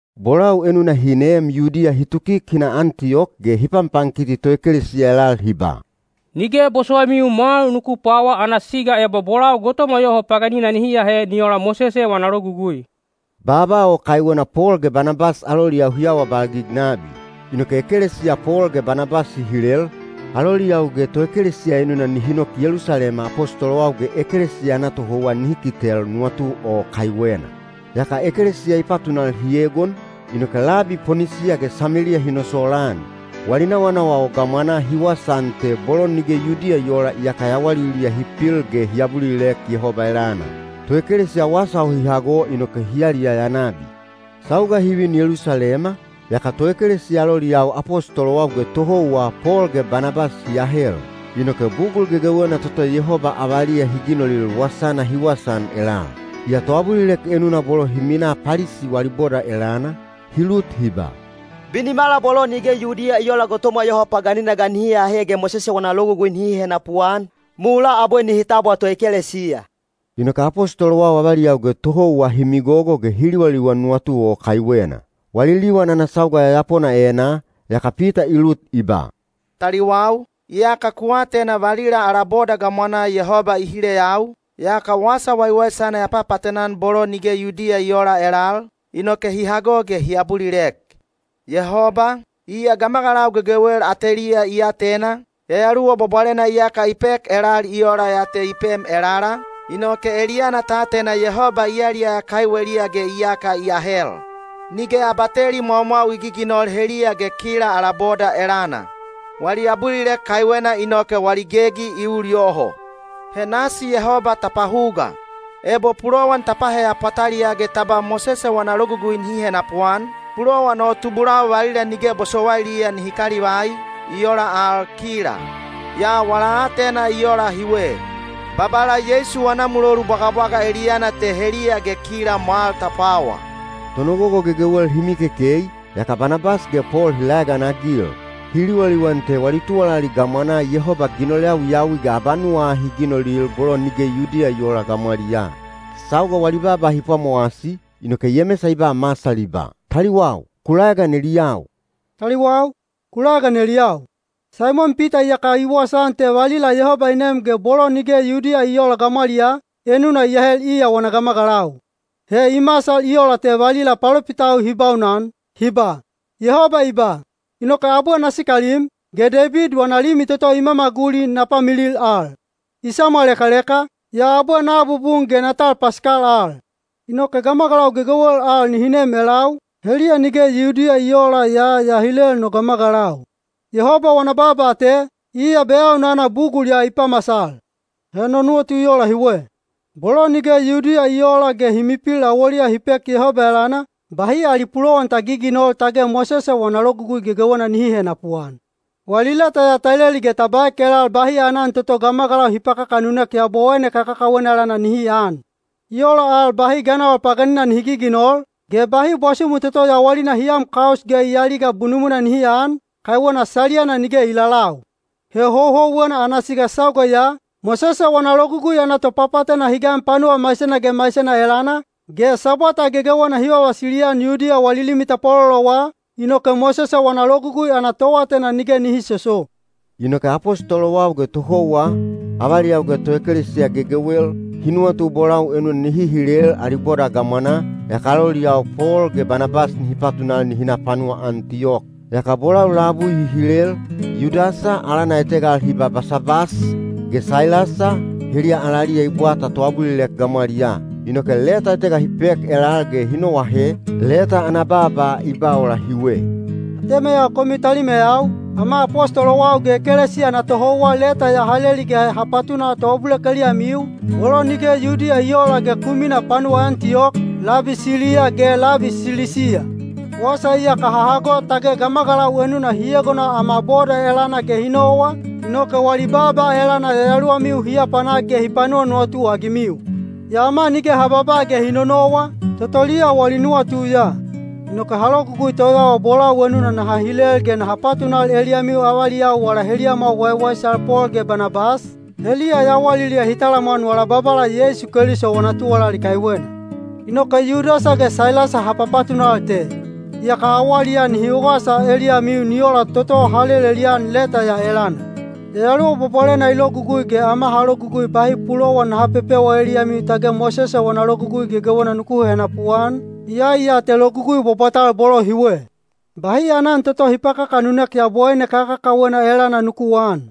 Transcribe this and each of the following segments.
Bolau enuna hi neem Yudiya hi tukik hi na Antiyok ge hi panpankiti toekelesiya elal hi ba, “Nige bosowaimiu mwal nuku pwawa ana siga ebo bolau gotomwa yoho paganina nihi ahe ni ola Mosese wana Logugui.” Baaba o kaiwena Pol ge Banabas aloliyau hi awabalgig nabi. Inoke ekelesiya Pol ge Banabas hi hilel, aloliyau ge toekelesiya enuna nihi nok Yelusalema apostolowau ge ekelesiya ana tohouwa nihi kitel nuwatu o kaiwena. Yaka ekelesiya i patunal hi egon, inoke labi Ponisiya ge Sameliya hi nosolaan. Wali nawanawa o gamwanaa hi wasaan te bolo nige Yudiya i oola iyaka yawaliliya hi pil ge hi abulilek Yehoba elana. Toekelesiya wasa o hi hago inoke hi yaliyaya nabi. Sauga hi vin Yelusalema, yaka toekelesiya aloliyau apostolowau ge tohouwa Pol ge Banabas hi ahel. Inoke bugul gegewena toto Yehoba avaliya hi ginolil wasana hi wasaan elal. Yaa toabulilek enuna bolo hi minaa Palisi wali boda elana, hi lut hi ba, “Binimala bolo nige Yudiya i oola gotomwa yoho paganina ga nihi ahe ge Mosese wana Logugui nihi henapuan, mulaa abwe nihi tabwa toekelesiya.” Inoke apostolowau avaliyau ge tohouwa hi migogo ge hi liwaliwan nuwatu o kaiwena. Wali liwan ana sauga yayapona enaa, yaka Pita i lut i ba, “Taliwau, iyaka ku atena valila ala boda gamwanaa Yehoba i hileyau, yaka wasa waiwaisana ya papaatena-an bolo nige Yudiya i oola elal, inoke hi hago ge hi abulilek. Yehoba, iya gamagalau gegewel ateliya i atena, Yayaluwa Bwabwalena iyaka i pek elal i ola ya te i pem elala, inoke eliyana ta atena Yehoba i yaliyaya kaiweliya ge iyaka i ahel. Nige abateli mwaumwau i giginol heliya ge kila ala boda elana. Wali abulilek kaiwena inoke wali gegi i ul yoho. He nasi Yehoba ta pahuga, ebo pulowan ta paheya pwataliyaa ge ta ba Mosese wana Logugui nihi henapuan, pulowan o tubulau valila nige bosowailiya nihi kalivai, i ola al kila. Yaa wala aatena i ola hiwe: Babala Yeisu wana mulolu bwagabwaga eliyana te heliya ge kila mwal ta pwawa.” Tonogogo gegewel hi mikekei, yaka Banabas ge Pol hi laeganagil. Hi liwaliwan te wali tuwalali gamwanaa Yehoba ginol yawiyawi ge abanuwa ahi i ginolil bolo nige Yudiya i oola gamwaliyaa. Sauga wali baaba hi pwamowasi, inoke Yemesa i ba masal i ba, “Taliwau, ku laegan eliyau. Saimon Pita iyaka i wasaan te valila Yehoba i nem ge bolo nige Yudiya i oola gamwaliyaa, enuna i ahel iya wana gamagalau. He i masal i ola te valila palopitau hi baunan, hi ba: Yehoba i ba, ‘Inoke abwe na sikalim, ge Deibid wana limi toto i mamaguli na pamilil al. I samwalekaleka, yaa abwe na abubun ge na tal pasikal al. Inoke gamagalau gegewel al nihi nem elau, heliya nige Yudiya i oola yaa ya hilel no gamagalau.’ Yehoba wana baaba te, iya beyaunana bugul ya i pamasal. “He no nuwatu i ola hiwe. Bolo nige Yudiya i oola ge hi mipil awoliya hi pek Yehoba elana, bahi ali pulowan ta giginol tage Mosese wana Logugui gegewena nihi henapuan. Wali leta ya ta leli ge ta baek elal bahi aanan toto gamagalau hi pakakanunek yabowaine kakakawena elana nihi aan. I ola al bahi ganawal paganina nihi giginol, ge bahi bwasumu toto yawalina hi am kaus ge i aliga bunumwina nihi aan, kaiwena saliyana nige i lalau. He houhouwena ana siga sauga ya, Mosese wana Logugui ana topapaatena hi gan panuwa maisena ge maisena elana, ge Sabwata gegewena hi vavasili-an Yudiya wali limi tapwalolowa, inoke Mosese wana Logugui ana toatena nige nihi soso.” Inoke apostolowau ge tohouwa, avaliyau ge toekelesiya gegewel, hi nuwatu bolau enuna nihi hilel ali boda gamwanaa, yaka aloliyau Pol ge Banabas nihi patunal nihi na panuwa Antiyok. Yaka bolau labui hi hilel, Yudasa, alana etega al hi ba Basabas, ge Sailasa, heliya alaliya i bwata toabulilek gamwaliyaa. Inoke leta etega hi pek elal ge hi noahe, leta ana baaba i ba ola hiwe: Atemeyau komiu talimeyau ge numeyau, Ama apostolowau ge ekelesiya ana tohouwa leta ya ha leli ge ha patuna toabulilek eliyamiu, bolo nige Yudiya i oola ge ku minaa panuwa Antiyok, labi Siliya ge labi Silisiya. Wasa iyaka ha hago tage gamagalau enuna hi egona ama boda elana ge hi nowa, inoke wali baaba elana yayaluwamiu hi apanak ge hi panuwanuwatu-agimiu. Yaa ama nige ha babaa ge hi nonowa, totoliya wali nuwatu ya. Inoke ha logugui toyawa bolau enuna naha hilel ge naha patunal eliyamiu avaliyau wala heliyamwau waiwaisal Pol ge Banabas, heliya yawaliliya hi talamwan wala Babala Yeisu Keliso wana tuwalali kaiwena. Inoke Yudasa ge Sailasa ha papatunal te, yaka awaliyaa nihi wasa eliyamiu ni ola toto ha lelelian leta ya elana. Yayaluwa Bwabwalena i logugui ge ama ha logugui bahi pulowan naha pepewa eliyamiu tage Mosese wana Logugui gegewena nuku henapuan, iyai ya te logugui bwabwatal bolo hiwe. Bahi aanan toto hi pakakanunek yabowaine kakakawena elana nuku aan.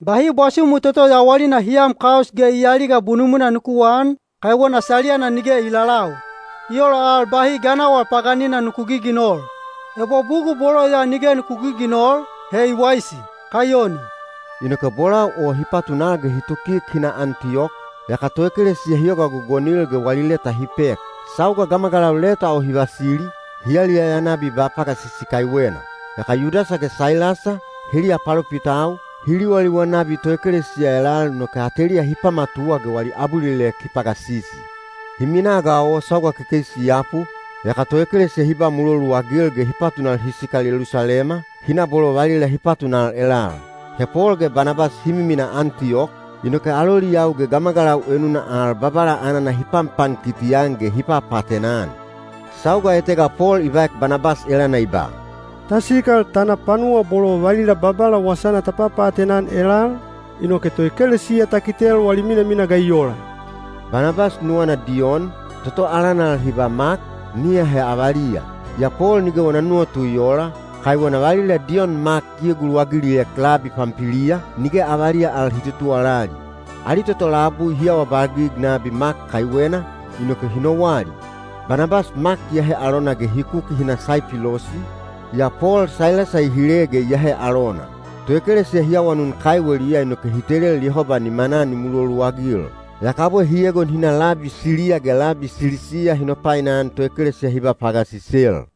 Bahi bwasumu toto yawalina hi am kaus ge i aliga bunumwina nuku aan, kaiwena saliyana nige i lalau. I ola al bahi ganawal paganina nuku giginol. Ebo bugul bolo ya nige nuku giginol, he i waisi. Kaiyoni. Inoke bolau o hi patunal ge hi tukik hi na Antiyok, yaka toekelesiya hi yoga gogonil ge wali leta hi pek. Sauga gamagalau leta o hi vasili, hi yaliyaya nabi ba pagasisi kaiwena. Yaka Yudasa ge Sailasa, heliya palopitau, hi liwaliwan nabi toekelesiya elal inoke ateliya hi pamatuwa ge wali abulilek hi pagasisi. Hi minaa ga o sauga kekeisi i yapu, yaka toekelesiya hi ba muloluagil ge hi patunal hi sikal Yelusalema, hi na bolo valila hi patunal elal. He Pol ge Banabas hi miminaa Antiyok, inoke aloliyau ge gamagalau enuna al Babala anana hi panpankiti-an ge hi papaatena-an. Sauga etega Pol i baek Banabas elana i ba, “Ta sikal ta na panuwa bolo valila Babala wasana ta papaatena-an elal, inoke toekelesiya ta kitel wali minamina ga i ola?” Banabas nuwana Diyon, toto alana al hi ba Mak, nihi ahe avaliya. Yaa Pol nige wana nuwatu i oola, kaiwena valila Diyon Mak i eguluwagiliek labi Pampiliya, nige avaliya al hi tutuwalali. Ali toto labui hi awabalgig nabi Mak kaiwena, inoke hi nowali. Banabas Mak i ahe alona ge hi kuki hi na Saipilosi, yaa Pol Sailasa i hile ge i ahe alona. Toekelesiya hi awanun kaiweliya inoke hi telel Yehoba nimanaa ni muloluagil. Yaka abwe hi egon hi na labi Siliya ge labi Silisiya hi nopainan toekelesiya hi ba pagasisel.